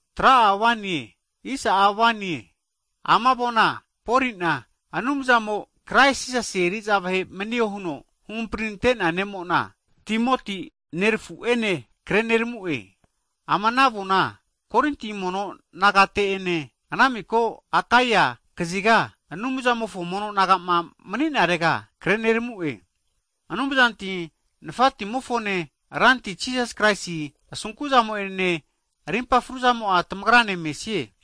Hagi ama avona Poli'na Anumzamo, Krais Jisasi'a aposol eri'za vahe manio huno huhamprinante ne'mo'nane, nerafu Timoti'ene kreneramu'e. Ama ana avona, Korinti mono nagate'ene ana miko Akai (Greece) kaziga Anumzamofo mono naga'ma mani'narega kreneramu'e. Anumzanti nafatimofone, Ranti Krais Jisasi asunkuzamo'ene rimpa fruzamo'a tamagrane mesie.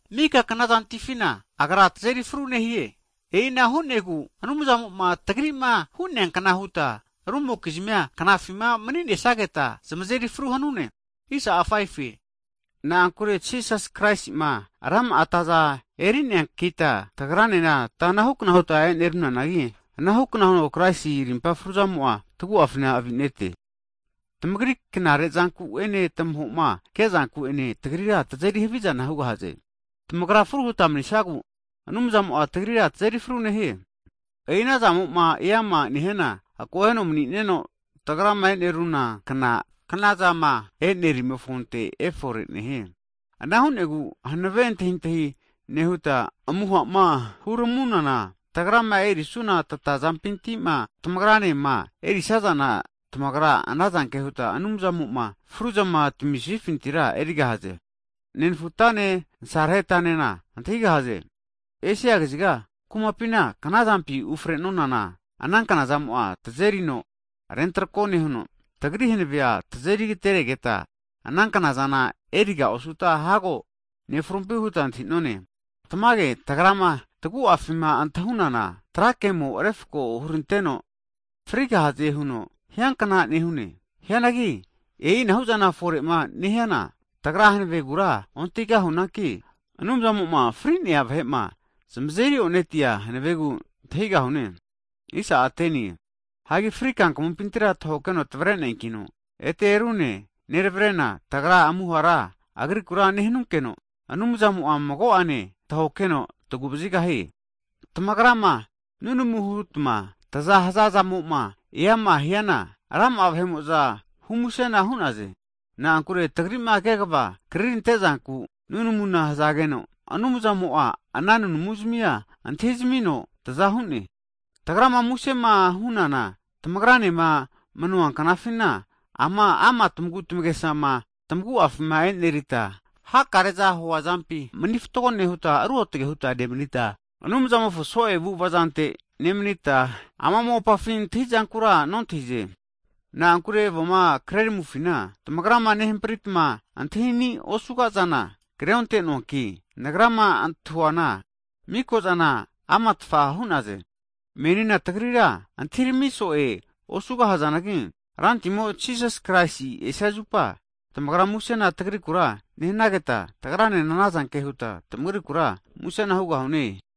Mika knazantifina Agra tazeri fru nehie. E'inahu nehigu Anumzamo'ma tagri'ma nehiankita rumokizmia knafima mani'nesageta zamazeri fru hanune. Na'ankure Jisas Kraisi'ma, rama'a ataza eri'neankita, tagranena tata anahukna huta enerunanagi, anahukna huno Kraisi rimpa fruzamo'a tagu'afina avi'nete. Tamagri knare zanku'ene tamaho'ma ke'zanku'ene, tagrira tazeri havizana hugahaze. Tamagrama fru huta manisagu, Anumzamo'a tagrira tazeri fru nehie. E'i ana zamo'ma eama nehiana, akoheno manineno, tagrama eneruna kna knazama e'nerimofonte efore nehie. Ana hu'negu hanave antahintahi nehuta amuha'ma huramunana, tagrama erisuna tatazampintima, tamagra'enenema erisazana, tamagra anazanke huta Anumzamo'ma fruzama tamisifintira erigahaze. Nenfugatane nasarehetanena antahigahaze, Esia kaziga kumapina knazampima ufre'nonana, ana kna'zamo'a tazerino arentakro nehuno, tagri hanavea tazeri agateregeta, ana knazana eriga osuta hago nefrumpi huta antahi'none. Tamage, tagrama tagu'afima antahunana, trake'mo refko huranteno frigahaze huno hiankna nehune. Hianagi e'inahuzama fore'ma nehiana, tagra hanavegura ontahigahunanki, Anumzamo'ma fri'nea vahe'ma zamazeri onetia hanavegu antahigahune. Hagi fri kankamumpintira tahokeno tavreneankino, ete rune, tavregahie huta tagra amuhara Agriku nehanunkeno Anumzamo'a mago'ane tahokeheno tagu vazigahie. Tamagrama nunamuma hutma taza hazazamo'ma eama hiana, rama'a vahe'mo'za hu musena hu'naze. Na'ankure tagri'ma kegava krirantezanku nunamuna hazageno, Anumzamo'a ana nunamuntamia antahizmino taza hu'ne. Hagi tagrama musema hunana, tamagra manuna knafina ama' tagu'tagesama tagu'afima e'nerita, hakare'za hu'nazampi mani fatgo nehuta, ruotge huta nemanita, Anumzamofo so'e avu'avazante nemanita, ama mopafi antahizankura ontahi'none. Na'ankure avoma kreraminofina, tamagrama nehampritma antahini osuga'zana kreonte'noanki, nagrama antahuana, mikozana amatfa hu'naze. Meninena tagrira tageta antahirami so'e osugahazanagi, Rantimo Jisas Kraisi esia zupa, tamagra musena tagrikura nehanageta, tagranena anazanke huta tamagrikura musena hugahune.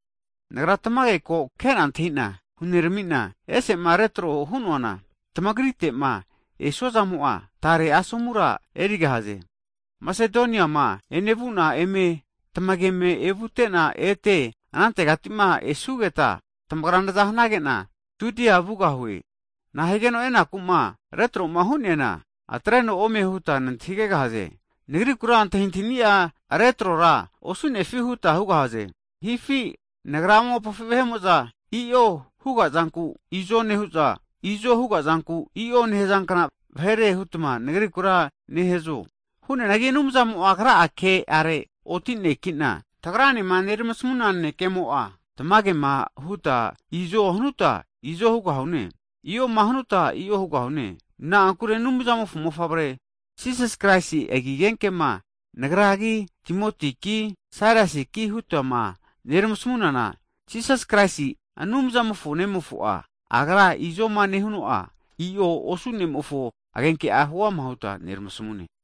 Nagra tamage ko ke'na antahina huneramina, ese'ma retro hu'noana, tamagrite'ma esu'azamo'a tare asomura erigahaze. Masedoniama enevuna eme tamageme evute'na, ete anantegatima esugeta tamagra naza hanage'na Judia vugahue. Nahigeno enaku'ma retroma hu'neana atreno ome huta nantahigegahaze? Nagrikura antahintahini'a retrora osu'nefi huta hugahaze? Hifi nagra ama mopafi vahe'mo'za i'o hugazanku izo nehu'za, izo hugazanku i'o nehazankna vahere hutma nagrikura nehazo? Hu'neanagi Anumzamo'a Agra'a ke'are oti ne'kina, tagranema neramasamuna nanekemo'a, tamagema huta izo hanuta, izo hugahune. I'oma hanuta, i'o hugahune. Na'ankure Anumzamofo mofavre Jisas Kraisi agi agenkema nagragi, Timotiki, Sailasiki hutama neramasmunana, Jisas Kraisi'a Anumzamofo nemofonku'ma huama huta neramasamunana, Agra izoma nehuno'a, i'o osu Ne'mofo agenke huama huta neramasamune.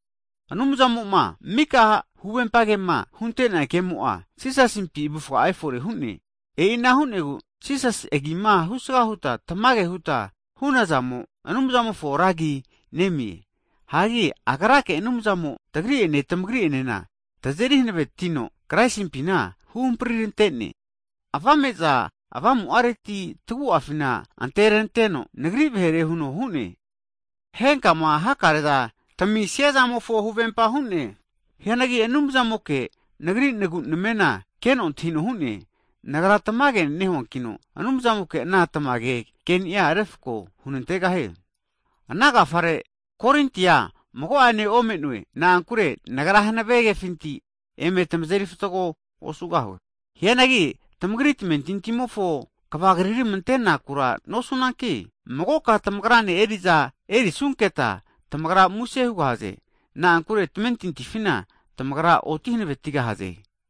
Anumzamo'ma mika huvempa kema huntea kemo'a, Jisasimpi avufga'a efore hu'ne. E'i ana hu'negu, Jisasi agima husga huta tamage huta hunazamo, Anumzamofona ra agi nemie. Hagi Agrake Anumzamo, tagri'ene tamagri enena tazeri hanavetino, Kraisimpina huhampritante'ne. Avame'za Avamu'areti tagu'afi anteneranteno Nagri vahere huno hu'ne. Henkama hakare'za tamisiazamofo huvempa hu'ne. Hianagi Anumzamoke nagri nagu'namena keno antahino hu'ne. Nagra tamage nehuankino Anumzamoke ana tamage keni'a refko hunantegahie. Ana agafare nagra Korinti kumatera mago'ane ome'noe. Na'ankure nagra hanave kefinti eme tamazeri fatgo osugahue. Hianagi tamagri tamentintimofo kvagriramante'nakura nosunanki, magoka tamagrane eri'za erisunketa tamagra muse hugahaze. Na'ankure tamentintifina, tamagra oti hanavetigahaze.